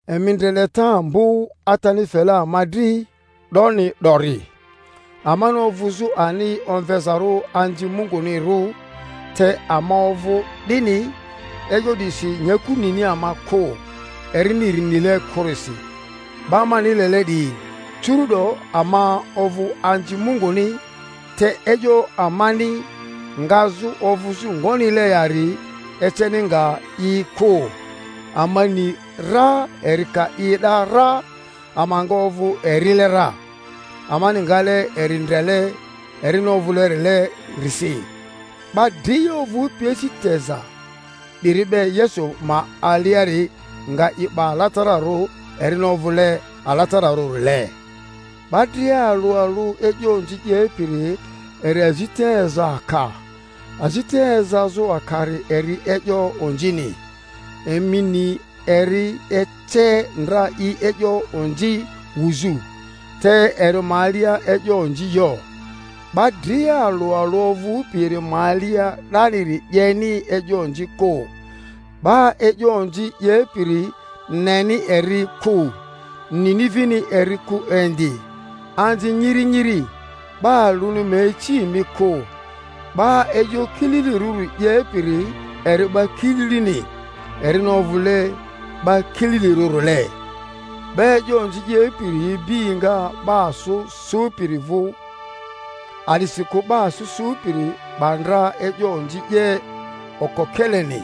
Emi ndre leta ambo Atani fele ama dri 'doni 'dori, amani ovᴜzᴜ ani omvezarᴜ anzi Mungunirᴜ; te ama ovᴜ 'dini. E'yo 'disi nyaku nini ama kᴜ, erini eri nile kᴜrisi. 'Ba mani lele 'diyi, curu'do ama ovᴜ anzi Munguni, te e'yo amani ngazᴜ ovᴜzᴜ ngonile yari eceni nga i kᴜ. Ama ni ra eri ka i e'da ra, ama nga ovᴜ erile ra, amani ngale eri ndrele erini ovᴜleri-lerisi. 'Ba dria ovᴜpi asi teza 'diri be Yesu ma aliari nga i 'ba alatararᴜ erini ovᴜle alatararᴜrile. 'Ba dria alᴜ alᴜ e'yo onzi 'yepiri eri azita eza aka; azita ezazᴜ akari eri e'yo onzini. Emi ni eri ece ndra i e'yo onzi wuzᴜ, te eri ma alia e'yo onzi yo. 'Ba dria alᴜ alᴜ ovᴜpi eri ma alia 'daniri 'yeni e'yo onzi kᴜ; 'ba e'yo onzi 'yepiri neni eri kᴜ, nini vini eri kᴜ indi. Anzi nyiri nyiri, 'ba alᴜni ma ici emi kᴜ. 'Ba e'yo kililirᴜri 'yepiri eri 'ba kililini, erini ovᴜle 'ba kililirᴜrile. 'Ba e'yo onzi 'yepiri ibi enga 'ba asᴜ sᴜpiri vᴜ; a'disikᴜ 'ba asᴜ sᴜpiri 'ba ndra e'yo onzi 'ye okokeleni.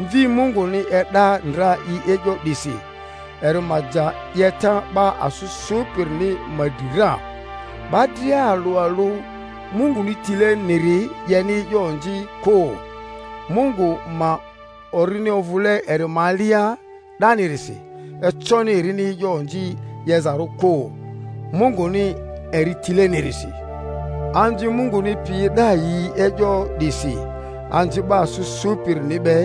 Mvi Munguni e'da ndra i e'yo 'disi, eri ma ja 'yeta 'ba asᴜ sᴜpirini ma dri ra. 'Ba dria alᴜ alᴜ Munguni tileniri 'yeni e'yo onzi kᴜ; Mungu ma orini ovᴜle eri ma alia 'danirisi, econi erini e'yo onzi 'yezarᴜ kᴜ, Munguni eri tilenirisi. Anzi Munguni piyi e'da yi e'yo 'disi anzi 'ba asᴜ sᴜpirini be: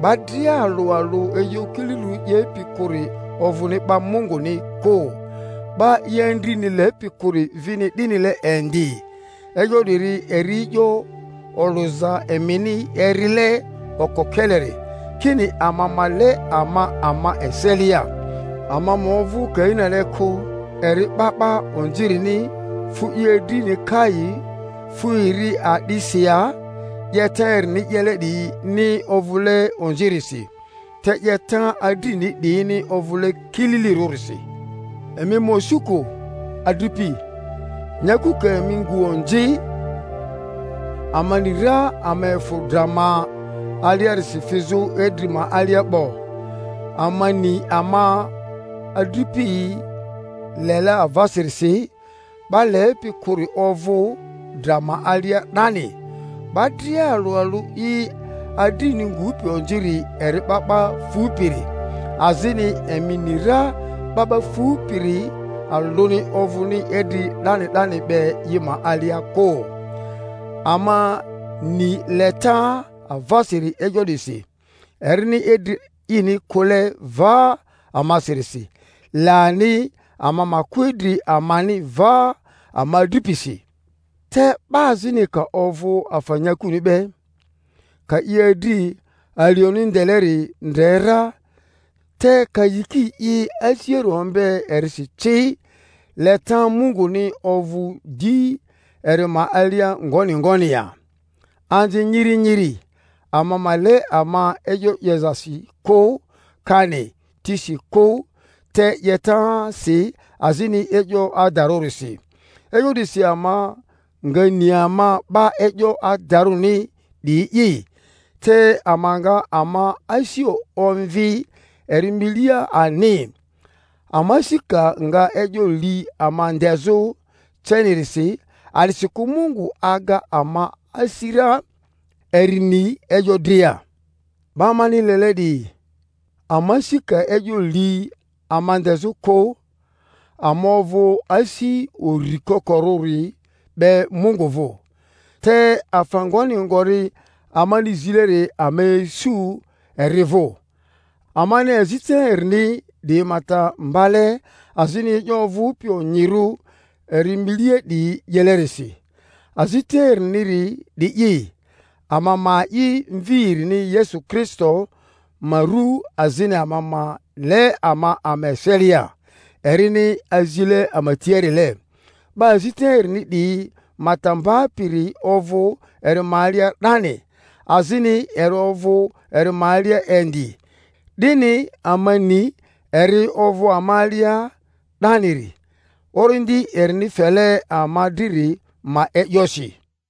'ba dria alᴜ alᴜ e'yo kililirᴜ 'yepi kᴜri ovᴜni 'ba Munguni kᴜ, 'ba i adrini lepi kᴜri vini 'dinile indi. E'yo 'diri eri e'yo olᴜza emini erile okokeleri, kini ama ma le ama ama eselia; ama ma ovᴜ Kainile kᴜ, eri 'ba 'ba onzirini, fu i adrini kai. Fu eri a'disi ya? 'Yeta erini 'yele 'diyini ovᴜle onzirisi, te 'yeta adrini 'diyini ovᴜle kililirᴜrisi. Emi ma osu kᴜ, adripi, nyaku ka emi ngu onzi. Ama ni ra ama efᴜ dra ma aliarisi fizᴜ idri ma alia 'bo, amani ama adripiyi lele avasirisi. 'Ba lepi kᴜri ovᴜ dra ma alia 'dani. 'Ba dria alᴜ alᴜ i adrini ngupi onziri eri 'ba 'ba fupiri, azini emi ni ra 'ba 'ba fupiri alᴜni ovᴜni idri 'dani 'dani be i ma alia kᴜ. Ama ni leta avasiri e'yo 'disi, erini idri ini kᴜle va amasirisi; le ani ama ma kᴜ idri amani va ama adripisi. Te 'ba azini ka ovᴜ afa nyakuni be, ka i adri alioni ndeleri ndre ra, te ka yiki i asiari ombe erisi ci, leta Munguni ovᴜ di eri ma alia ngoni ngoni ya? Anzi nyiri nyiri, ama ma le ama e'yo 'yozasi kᴜ, kani tisi kᴜ, te 'yetasi azini e'yo adarᴜrisi. E'yo 'disi ama nga ni ama 'ba e'yo adarᴜni 'diyi'i, te ama nga ama asi omvi eri milia ani, ama asi ka nga e'yo li ama ndezᴜ cenirisi; a'disikᴜ Mungu aga ama asi ra, eri ni e'yo dria. 'Ba mani lele 'diyi, ama asi ka e'yo li ama ndezᴜ kᴜ, ama ovᴜ asi uri kokorᴜri be Mungu vᴜ; te afa ngoni ngori amani zileri ama isu eri vᴜ, amani azita erini 'diyi ma ta mbale azini e'yo ovᴜpi onyirᴜ eri milia 'diyi 'yelerisi. Azita eriniri 'di'i, ama ma a'i Mvi erini Yesu Kristo ma ru azini ama ma le ama ama eselia, erini azile ama tiarile. 'Ba azita erini 'diyi ma ta mbapiri ovᴜ eri ma alia 'dani, azini eri ovᴜ eri ma alia indi. 'Dini ama ni eri ovᴜ ama alia 'daniri, Orindi erini fele ama driri ma e'yosi.